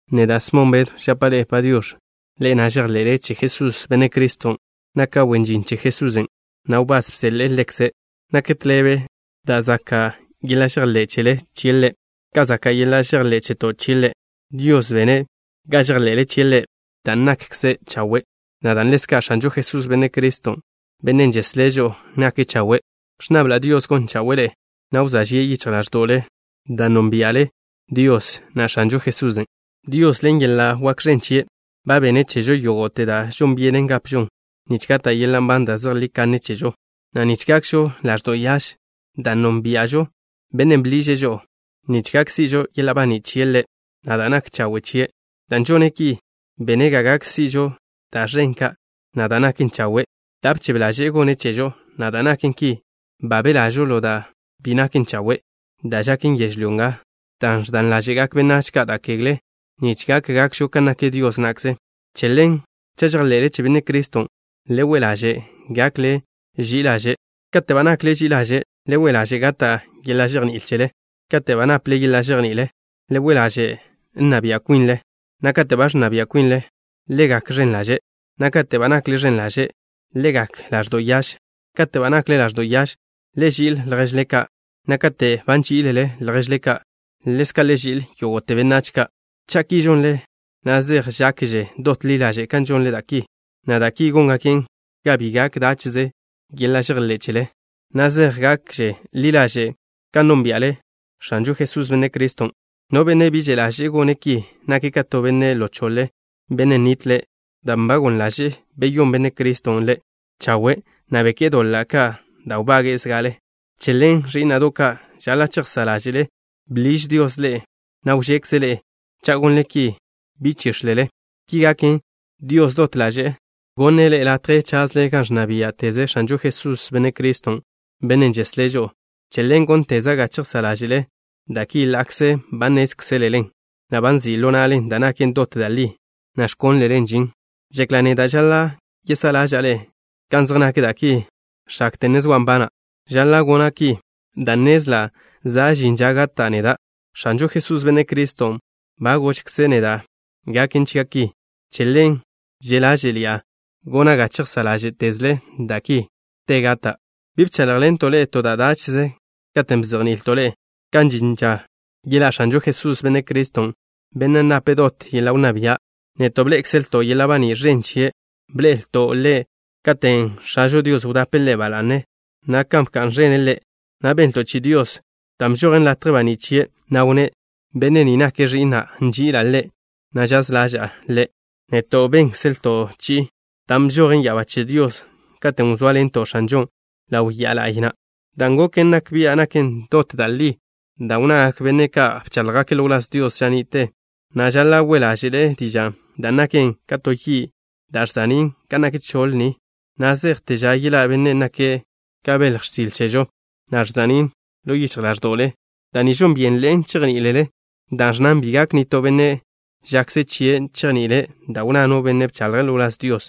Neda', Smon Bedw, žapa' ḻe'e “Padiox̱”, ḻe'e na' žejḻe'le che Jesús, Benne' Criston'. Naka' wen žin che Jesusen', na' wbás bseḻe'e Ḻekze'. Nak tḻebe da' zaka' yeḻa' žejḻé' chele chie' Ḻe', ka zaka' yeḻa' žejḻé' cheto' chie' Ḻe'. Dios bene' ga žejḻe'le chie' Ḻe' dan' nakkze' chawe', na' dan' ḻezka' X̱anžo Jesús, Benne' Criston', Bennen' žeslé' žo'o, nake' chawe'. Ẕnnabla' Dios gon chawe'e ḻe'e, na' wzóa žie' yichj ḻáẕdo'le dan' nónbia'le Dios, na' X̱anžo Jesusen'. Dios, ḻen yeḻa' wak ẕen chie', ba benne' chežo yógo'te da' žon byenen gapžon nich gata' yeḻa' nban da' zejlí kanne chežo, na' nich gakžo ḻaẕdo' yaž, dan' nónbia'žo Bennen' bḻiže' žo'o nich gak si'žo yeḻa' baní' chie' Ḻe', na' da' nak chawe' chie'. Dan' žone' ki, bene' ga gak si'žo da' ẕen ka', na' da' naken chawe' da' bchebe ḻaže'e gonne' chežo, na' dan' naken ki, ba belažo ḻo da' bi naken chawe' da' žaken yežlyó nga dan' ẕdan ḻáže'gak benách ka' da' kegle, nich gak gakžo kan nak Dios na'kze. Che ḻen, cha' žejḻe'le che Benne' Criston', le we' ḻaže' gakle ži'i ḻaže'. Kate' ba nakle ži'i ḻaže', le we' ḻaže' gata' yeḻa' žejní'il chele. Kate' ba naple yeḻa' žejní'il, le we' ḻaže' nna bia' kwinle, na' kate' ba ẕnna bia' kwinle, le gak ẕen ḻaže', na' kate' ba nakle ẕen ḻaže', le gak ḻaẕdo' yaž. Kate' ba nakle ḻaẕdo' yaž, le ži'il lježle ka', na' kate' ba nží'ilele lježle ka', ḻezka' le ži'il yógo'te benách ka'. Cha' ki žonle, na' zej žakže dot ḻi ḻaže' kan žonle da' ki, na' da' ki góngaken ga bi gak dáche'ze yeḻa' žejḻé' chele, na' chej gakže ḻi ḻaže' kan nónbia'le X̱anžo Jesús, Benne' Criston'. No benne' bi že' ḻaže'e gone' ki, nake' ka to benne' ḻo choḻe, benne' nitle', dan' ba goḻ ḻaže'e beyón Benne' Criston' ḻe' chawe', na' beké'e doḻa' ka' da' wbage'e zga'ale. Che ḻen, ẕí'na'do' ka', žaḻa' chejsá' ḻáže'le bḻiž Dios ḻe'e, na' wžekze' ḻe'e. Cha' gonle ki, bi chíx̱lele. Ki gaken, Dios dot ḻaže'e gonne' ḻe'e latje chazle gan ẕnna biá'teze X̱anžo Jesús, Benne' Criston', Bennen' žeslé' žo'o. Che ḻen gónteza' ga chejsá' ḻáže'le da' ki ḻa'kze ba nnézkzelelen, na' ba nzi' ḻo na'le da' naken dot da' li, na' ẕkónlelen žin. Žekla' neda' žaḻa' yesá'a ḻáže'le kan zej nak da' ki x̱akte ne zoa' nbana'. Žaḻa' gona' ki dan' nnezla' za' žin ža gata' neda'. X̱anžo Jesús, Benne' Criston', ba gožkze' neda' gaken chia' ki. Che ḻen že' ḻáže'ḻi'a gona' ga chejsá' ḻáže'tezle da' ki te gata'. Bi bcháḻjḻento' ḻe'e to da' dáche'ze katen' bzejni'ilto' ḻe'e kan žin ža yeḻá' X̱anžo Jesús, Benne' Criston', Bennen' nape' dot yeḻa' wnná bia'. Neto' bḻé'ekzelto' yeḻa' baní' ẕen chien'. Bḻe'elto' Ḻe' katen' X̱ažo Dios wdape' Ḻe' ba la'ne, na' bka'n ẕene' Ḻe', na' benlto' chi'i Dios, dan' bžojen latje baní' chie', na' wnné': “Benne' ni nake' Ẕi'na'. Nži'ila' Ḻe', na' žaz ḻaža'a Ḻe'.” Neto' bénkzelto' chi'i na', dan' bžojen ya'abá che Dios katen' wzóaḻento' X̱anžon' ḻaw ya'a la'y na'. Dan' goken nak bian' nak dot da' li da' wnnagak benne' ka' bcháḻjgake' ḻo wláz Dios ža ni'te, na' žaḻa' we' ḻáže'le dižan', dan' naken ka to yi' da' ẕza'ní' gan nak choḻ ni, na' zejte ža yeḻá' Bennen' nake' ka belj x̱sile chežo, na' ẕza'nín' ḻo yichj ḻáẕdo'le. Da' ni žon byenḻe'en chejní'ilele, dan' ẕnnan: “Bi gak nitó benne', žakze chie', chejni'ile' da' wnná no benne' bchaḻje' ḻo wláz Dios.”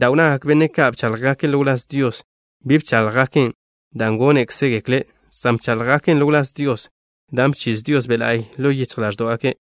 Da' wnnagak benne' ka' bcháḻjgake' ḻo wláz Dios, bi bcháḻjgaken' dan' gónekzegekle', san bcháḻjgake' ḻo wláz Dios da' bchiz Dios Be' La'y ḻo yichj ḻáẕdo'gake'.